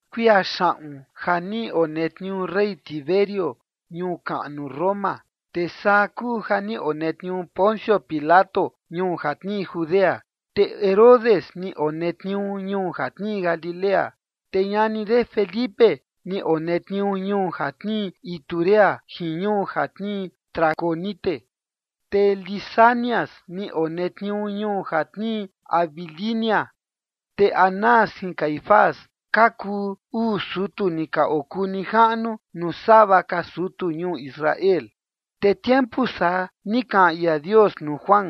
Kuia xaꞌun ja ni onetniuu rey Tiberio ñuu kaꞌnu Roma, te saa kuu ja ni onetniuu Poncio Pilato ñuu ja tnii Judea, te Herodes ni onetniuu ñuu ja tnii Galilea, te ñani de Felipe ni onetniuu ñuu ja tnii Iturea jin ñuu ja tnii Traconite, te Lisanias ni onetniuu ñuu ja tnii Abilinia. Te Anás jin Caifás ka kuu uu sutu ni ka okuu nijaꞌnu nuu sava ka sutu ñuu Israel. Te tiempu saa, ni kaꞌan ia Dios nuu Juan,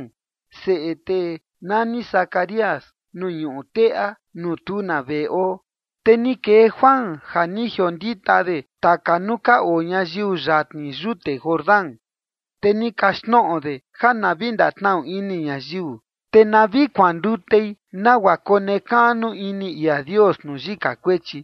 seꞌe tee nani Zacarías, nuu ñuꞌu teꞌa, nuu tu na veꞌe oo. Te ni kee Juan ja ni jiondita de taka nuu ka oo ñayiu yatni yute Jordán. Te ni kaxtnoꞌo de ja na vi ndatnaꞌu ini ñayiu, te na vi kuandutei nagua konekaꞌnu ini ia Dios nuu yika kuechi.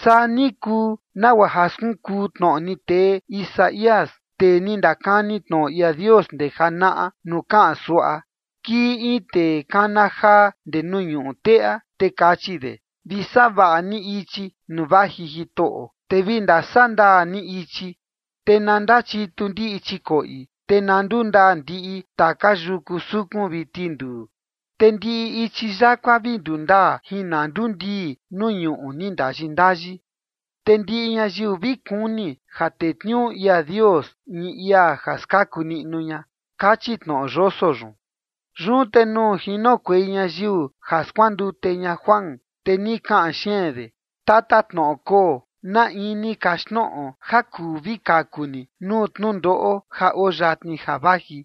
Saa ni kuu nagua ja skunkuu tnoꞌo ni tee Isaías, tee ni ndakani tnoꞌo ia Dios ndee janaꞌa, nuu kaꞌan suaꞌa: Kii in tee kana jaa ndee nuu ñuꞌu teꞌa, te kachi de: “Vi savaꞌa ni ichi nuu vaji Jitoꞌo. Te vi ndasaꞌa ndaa ni ichi. Te na ndachitu ndiꞌi chikoꞌi, te na ndundaa ndiꞌi taka yuku sukun vi tinduu. Te ndiꞌi ichi yakua vi ndundaa, jin na ndundii nuu ñuꞌu ni ndayi ndayi. Te ndiꞌi ñayiu vi kuni ja tetniuu ia Dios in ia ja skaku niꞌnu ña” kachi tnoꞌo yoso yun. Yun te nuu jinokuei ñayiu ja skuandute ña Juan, te ni kana xeen de: ―Tatatnoꞌo koo, ¿na in ni kaxtnoꞌo ja kuu vi kaku ni nuu tnundoꞌo ja oo yatni ja vaji?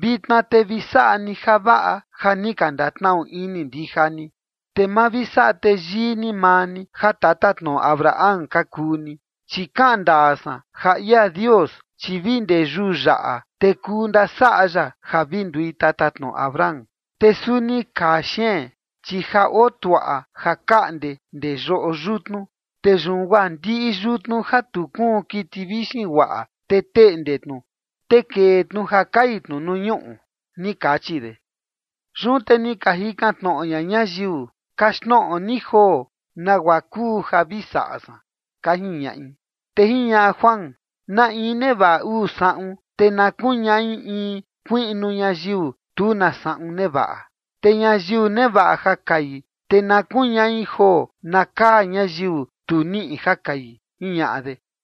Vitna, te vi saꞌa ni javaꞌa ja ni ka ndataꞌu ini ndija ni. Te ma vi saꞌa teyii ni maa ni ja tatatnoꞌo Abraham ka kuu ni, chi kaꞌan ndaa san ja ia Dios, chi vi ndee yuu yaꞌa te kuu ndasaꞌa ya ja vi ndui tatatnoꞌo Abraham. Te suni kaa xeen, chi ja oo tuaꞌa ja kaꞌnde ndee yoꞌo yutnu. Te yun guaa ndiꞌi yutnu ja tu kuun kiti vixin guaꞌa, te teꞌnde tnu, te kee tnu ja kai tnu nuu ñuꞌu ―ni kachi de. Yun te ni ka jikan tnoꞌo ña ñayiu: ―Kaxtnoꞌo ni joo, ¿nagua kuu ja vi saꞌa san? ―ka jiñaꞌi. Te jiñaꞌa Juan: ―Na in nevaꞌa uu saꞌun, te na kuñaꞌi in kuiꞌnu ñayiu tu na saꞌun nevaꞌa. Te ñayiu nevaꞌa ja kai, te na kuñaꞌi joo na kaa ñayiu tu niꞌi ja kai ―jiñaꞌa de.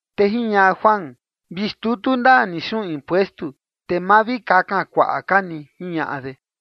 Te jiñaꞌa Juan: ―Vi xtutu ndaa ni xuꞌun impuestu, te ma vi kakan kuaꞌa ka ni ―jiñaꞌa de.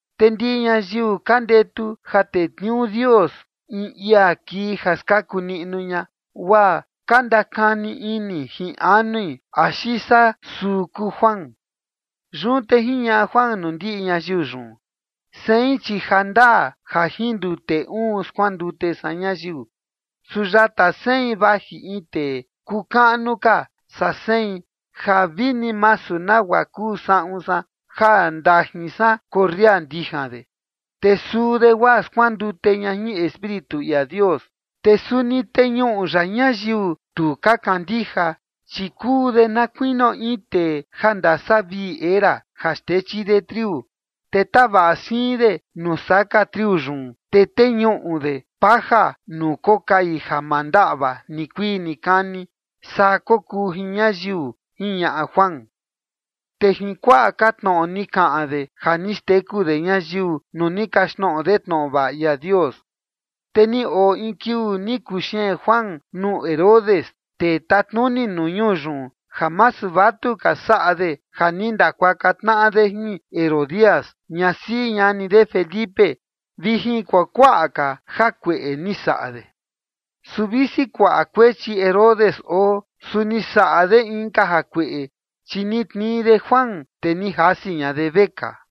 Te ndiꞌi ñayiu ka ndetu ja tetniuu Dios in ia kii ja skaku niꞌnu ña, guaa ka ndakani ini jin anui axi saa suu kuu Juan. Yun te jiñaꞌa Juan nuu ndiꞌi ñayiu yun: ―Sein, chi ja ndaa ja jin ndute uun skuandute san ñayiu, su yata sein vaji in tee kuu kaꞌnu ka saa sein ja vini masu nagua kuu saꞌun san ja ndajin san korria ndijan de. Te suu de guaa skuandute ña jin Espíritu ia Dios, te suni teñuꞌu ya ñayiu tu ka kandija. Chi kuu de na kuinio in tee ja ndasavii era ja xtechi de triu, te tavaꞌa siin de nuu saka triu yun, te teñuꞌu de paja nuu kokai ja ma ndaꞌva nikuii nikani. Saa kokuu jin ñayiu ―jiñaꞌa Juan. Te jin kuakuaꞌa ka tnoꞌo ni kaꞌan de ja ni xteku de ñayiu nuu ni kaxtnoꞌo de tnoꞌo vaꞌa ia Dios. Te ni oo in kiuu ni kuxeen Juan nuu Herodes, tee tatnuni nuu ñuu yun, ja masu vatuka saꞌa de ja ni ndakuaka tnaꞌa de jin Herodías, ñasiꞌi ñani de Felipe, vi jin kuakuaꞌa ka jakueꞌe ni saꞌa de. Su visi kuaꞌa kuechi Herodes oo, su ni saꞌa de inka jakueꞌe, chi ni tnii de Juan, te ni jasi ña de vekaa.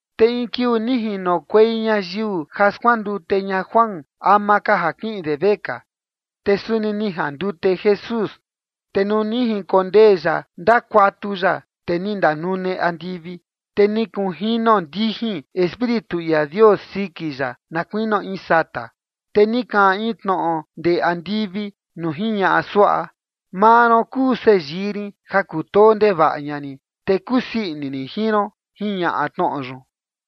Te in kiuu ni jinokuei ñayiu ja skuandute ña Juan ama ka ja kiꞌin de vekaa. Te suni ni jandute Jesús. Te nuu ni jinkondee ya ndakuatu ya, te ni ndanune andivi. Te ni kunjino ndijin Espíritu ia Dios siki ya na kuinio in sata. Te ni kaꞌan in tnoꞌo ndee andivi nuu jiñaꞌa suaꞌa: ―Maa ron kuu seyii rin ja kutoo ndevaꞌa ña rin, te kusii ini rin jin ron ―jiñaꞌa tnoꞌo yun.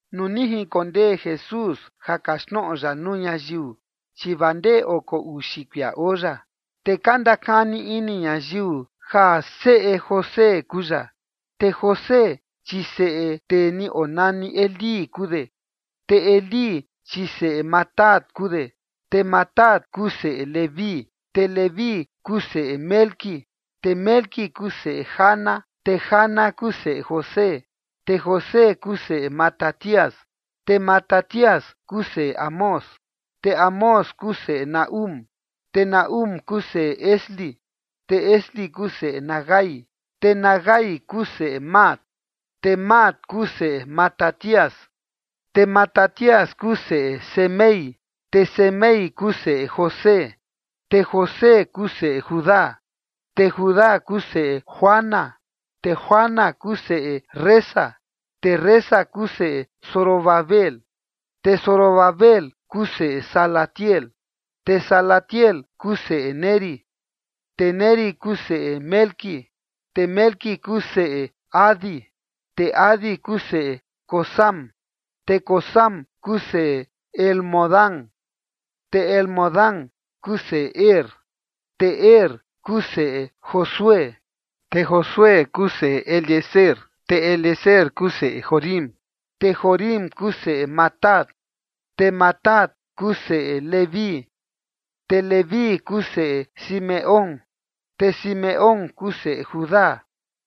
Nuu ni jinkondee Jesús ja kaxtnoꞌo ya nuu ñayiu, chi vaa ndee oko uxi kuia oo ya. Te ka ndakani ini ñayiu ja seꞌe José kuu ya. Te José, chi seꞌe tee ni onani Elí kuu de. Te Elí, chi seꞌe Matat kuu de, te Matat kuu seꞌe Leví, te Leví kuu seꞌe Melqui, te Melqui kuu seꞌe Jana, te Jana kuu seꞌe José. Te José kuu seꞌe Matatías, te Matatías kuu seꞌe Amós, te Amós kuu seꞌe Nahúm, te Nahúm kuu seꞌe Esli, te Esli kuu seꞌe Nagai. Te Nagai kuu seꞌe Maat, te Maat kuu seꞌe Matatías, te Matatías kuu seꞌe Semei, te Semei kuu seꞌe José, te José kuu seꞌe Judá. Te Judá kuu seꞌe Joana, te Joana kuu seꞌe Resa, te Resa kuu seꞌe Zorobabel, te Zorobabel kuu seꞌe Salatiel, te Salatiel kuu seꞌe Neri. Te Neri kuu seꞌe Melqui, te Melqui kuu seꞌe Adi, te Adi kuu seꞌe Cosam, te Cosam kuu seꞌe Elmodam, te Elmodam kuu seꞌe Er. Te Er kuu seꞌe Josué, te Josué kuu seꞌe Eliezer, te Eliezer kuu seꞌe Jorim, te Jorim kuu seꞌe Matat. Te Matat kuu seꞌe Leví, te Leví kuu seꞌe Simeón, te Simeón kuu seꞌe Judá,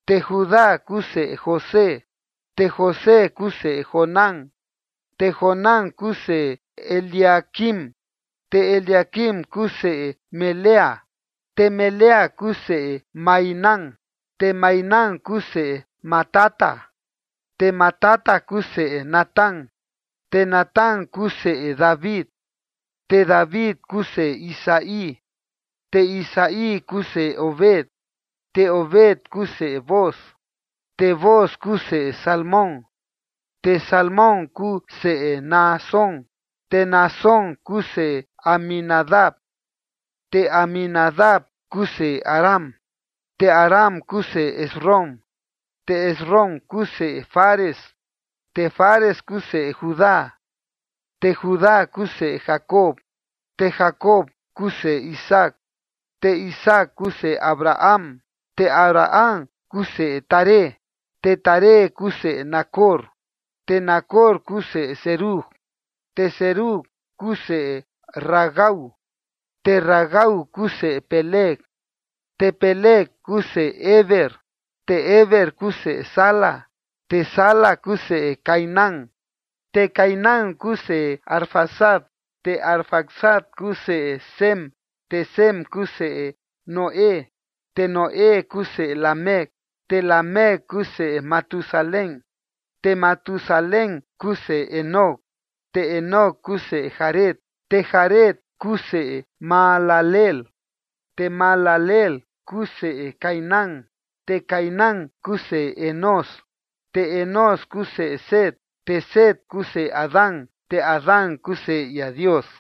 te Judá kuu seꞌe José, te José kuu seꞌe Jonán, te Jonán kuu seꞌe Eliaquim. Te Eliaquim kuu seꞌe Melea, te Melea kuu seꞌe Mainán, te Mainán kuu seꞌe Matata, te Matata kuu seꞌe Natán. Te Natán kuu seꞌe David, te David kuu seꞌe Isaí, te Isaí kuu seꞌe Obed, te Obed kuu seꞌe Booz, te Booz kuu seꞌe Salmón, te Salmón kuu seꞌe Naasón. Te Naasón kuu seꞌe Aminadab, te Aminadab kuu seꞌe Aram, te Aram kuu seꞌe Esrom, te Esrom kuu seꞌe Fares, te Fares kuu seꞌe Judá. Te Judá kuu seꞌe Jacob, te Jacob kuu seꞌe Isaac, te Isaac kuu seꞌe Abraham, te Abraham kuu seꞌe Taré, te Taré kuu seꞌe Nacor. Te Nacor kuu seꞌe Serug, te Serug kuu seꞌe Ragau, te Ragau kuu seꞌe Peleg, te Peleg kuu seꞌe Heber, te Heber kuu seꞌe Sala. Te Sala kuu seꞌe Cainán, te Cainán kuu seꞌe Arfaxad, te Arfaxad kuu seꞌe Sem, te Sem kuu seꞌe Noé, te Noé kuu seꞌe Lamec. Te Lamec kuu seꞌe Matusalén, te Matusalén kuu seꞌe Enoc, te Enoc kuu seꞌe Jared, te Jared kuu seꞌe Mahalaleel, te Mahalaleel kuu seꞌe Cainán. Te Cainán kuu seꞌe Enós, te Enós kuu seꞌe Set, te Set kuu seꞌe Adán, te Adán kuu seꞌe ia Dios.